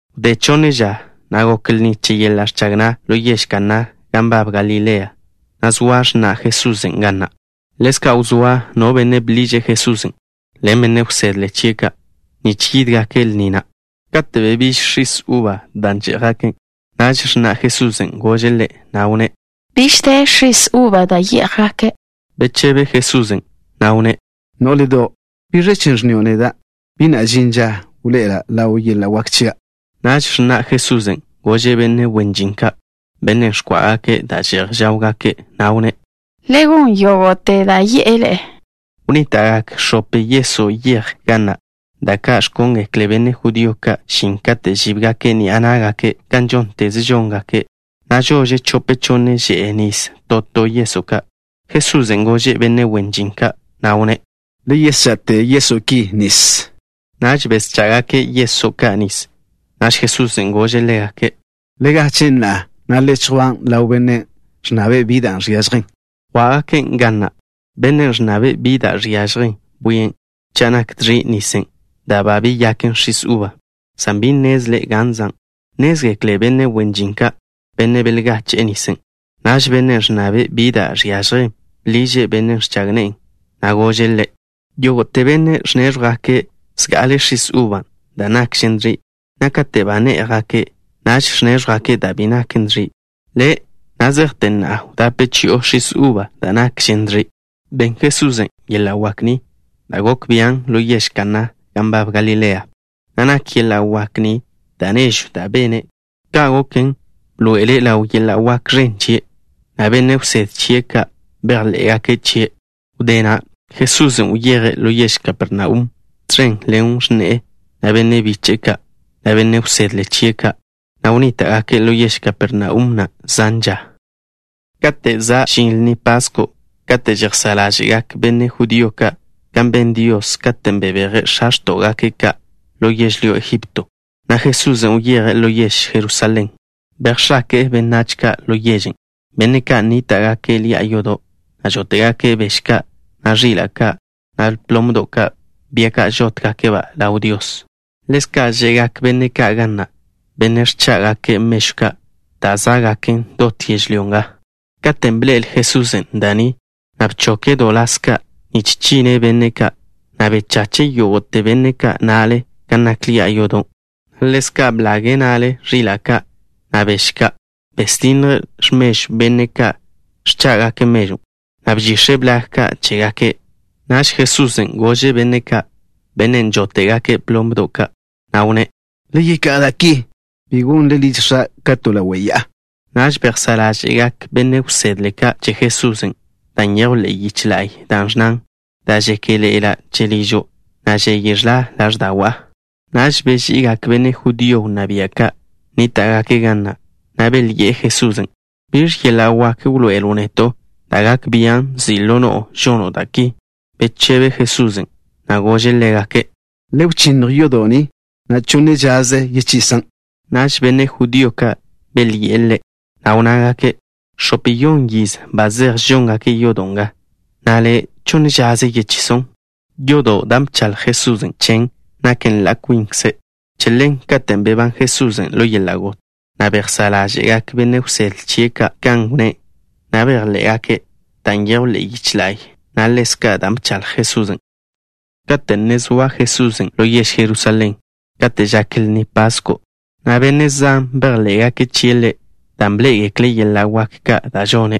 Wdé chonne ža, gok lni che yeḻa' ẕchag na' ḻo yež Kaná gan nbab Galilea, na' zoa x̱na' Jesusen' ga na'. Ḻezka' wzóa no benne' bḻiže' Jesusen' ḻen benne' wsedle chie' ka', nich yídgake' lni na'. Kate' bebíž x̱is uba, dan' yé'jgake', x̱na' Jesusen' gože' Ḻe', na' wnné': —Biž de x̱is uban' da' žé'jgaken'. Bechebe Jesusen', na' wnné': —Nó'ledo'. ¿Biẕ chen' ẕnnio' neda'? Bi na' žin ža wḻoe'ela' ḻaw yeḻa' wak chia'. Naž x̱na' Jesusen' gože' benne' wen žin ka', benne' ẕkwá'gake' da' že'j žáwgake', na' wnné': —Le gon yógo'te da' yi'e ḻe'e. Wnníta'gak x̱ope yeso' yej ga na', da' ka' ẕkóngekle benne' judío ka' žin kate' žíbgake' ni'a ná'gake' kan žónteze žóngake', na' žože chope chonne že'e nis to to yeso' ka'. Jesusen' gože' benne' wen žin ka', na' wnné': —Le yescha'te yeso' ki nis. Naž beschá'gake' yeso' ka' nis. Naž Jesusen' gože' ḻégake': —Le gachen' na'a, na' le chjwan' ḻaw benne' ẕnnabe' bi da' žiažjen. Yjwá'gaken' ga na'. Bennen' ẕnnabe' bi da' žiažjen bwien' cha' nak dẕi' nisen' da' ba beyaken x̱is uba, san bi nnezle' gan zan'. Nnézgekle benne' wen žin ka', benne' belgache'e nisen'. Naž bennen' ẕnnabe' bi da' žiažjen bḻiže' bennen' ẕchag ne'e, na' gože' ḻe': —Yógo'te benne' ẕnéẕjwgake' zga'ale x̱is uba dan' nakžen dẕi', na' kate' ba né'jgake', naž ẕnéẕjwgake' da' bi naken dẕi'. Le', na' zejte na'a wdape chi'o x̱is uba da' nakžen dẕi'. Ben Jesusen' yeḻa' wak ni, da' gok bian', ḻo yež Kaná gan nbab Galilea, na' nak yeḻa' wak ni da' nežw da' bene'. Ka' goken, bḻoe'ele' ḻaw yeḻa' wak ẕen chie', na' benne' wsedle chie' ka' bejḻé'gake' chie'. Wdé na' Jesusen' wyeje' ḻo yež Kapernaum, tẕen ḻen x̱ne'e, na' benne' biche'e ka', na' benne' wsedle chie' ka', na' wnníta'gake' ḻo yež Kapernaum na' zan ža. Kate' za' žin Lni Pasko' kate' žejsá' ḻáže'gak benne' judío ka' kan ben Dios katen' bebeje' x̱a x̱tó'gake' ka' ḻo yežlyó Egipto, na' Jesusen' wyeje' ḻo yež Jerusalén. Bejx̱ake'e benách ka' ḻo yežen', benne' ka' nníta'gake' ḻi'a yodo', na' žóte'gake' bež ka', na' ẕila' ka', na' plomdo' ka', bia ka' žótgake'-ba' ḻaw Dios. Ḻezka' že'gak benne' ka' ga na', benne' ẕchá'gake' mežw ka' da' zá'gaken dot yežlyó nga. Katen' bḻe'el Jesusen' da' ni, na' bchoke' do ḻas ka' nich chinne' benne' ka', na' bechache' yógo'te benne' ka' na'le gan nak ḻi'a yodo', na' ḻezka' blage' na'le ẕila' ka', na' bež ka'. Besdinnje' x̱mežw benne' ka' ẕchá'gake' mežwn', na' bžix̱e' blag ka' chégake'. Naž Jesusen' gože' benne' ka', benne' žóte'gake' plomdo' ka', na' wnné': —Le yeká'a da' ki. Bi gonle liž X̱a' ka to ḻawe' ya'a. Naž bejsá' ḻáže'gak benne' wsedle ka' che Jesusen' da' nyejw ḻe'e yiche la'y, da' ẕnnan: “Dan' žéke'ḻe'ela' che ližo', na' žeye ẕḻa ḻáẕda'wa'.” Naž beži'igak benne' judío wnná bia' ka' nníta'gake' ga na', na' belyi'e Jesusen': —¿Biẕ yeḻa' wak wḻoe'elo' neto' da' gak bian' nzi' ḻo no'o žono' da' ki? Bechebe Jesusen', na' gože' ḻégake': —Le wžía yi' yodo' ni, na' yechonne žaze yechisan'. Naž benne' judío ka' belyi'e Ḻe', na' wnnágake': —X̱ope-yon yiz ba zej žóngake' yodo' nga, na' Le', ¿chonne žaze yechison'? Yodon', dan' bchaḻj Jesusen' chen, naken ḻa' kwinkze'. Che ḻen, katen' bebán Jesusen' ḻo yeḻa' got, bejsá' ḻáže'gak benne' wsedle chie' ka' kan wnné', na' bejḻé'gake' da' nyejw ḻe'e yiche la'y, na' ḻezka' da' bchaḻj Jesusen'. Kate' ne zoa Jesusen' ḻo yež Jerusalén, kate' žak Lni Pasko', benne' zan bejḻé'gake' chie' Ḻe', dan' bḻé'egekle' yeḻa' wak ka' da' žone'.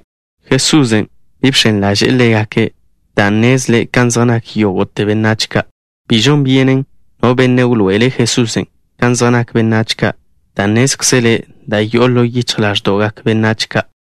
Jesusen' bi bx̱en ḻaže'e ḻégake', dan' nnezle' kan zej nak yógo'te benách ka'. Bi žon byenen no benne' wḻoe'ele' Jesusen' kan zej nak benách ka', dan' nnézkzele' da' yo'o ḻo yichj ḻáẕdo'gak benách ka'.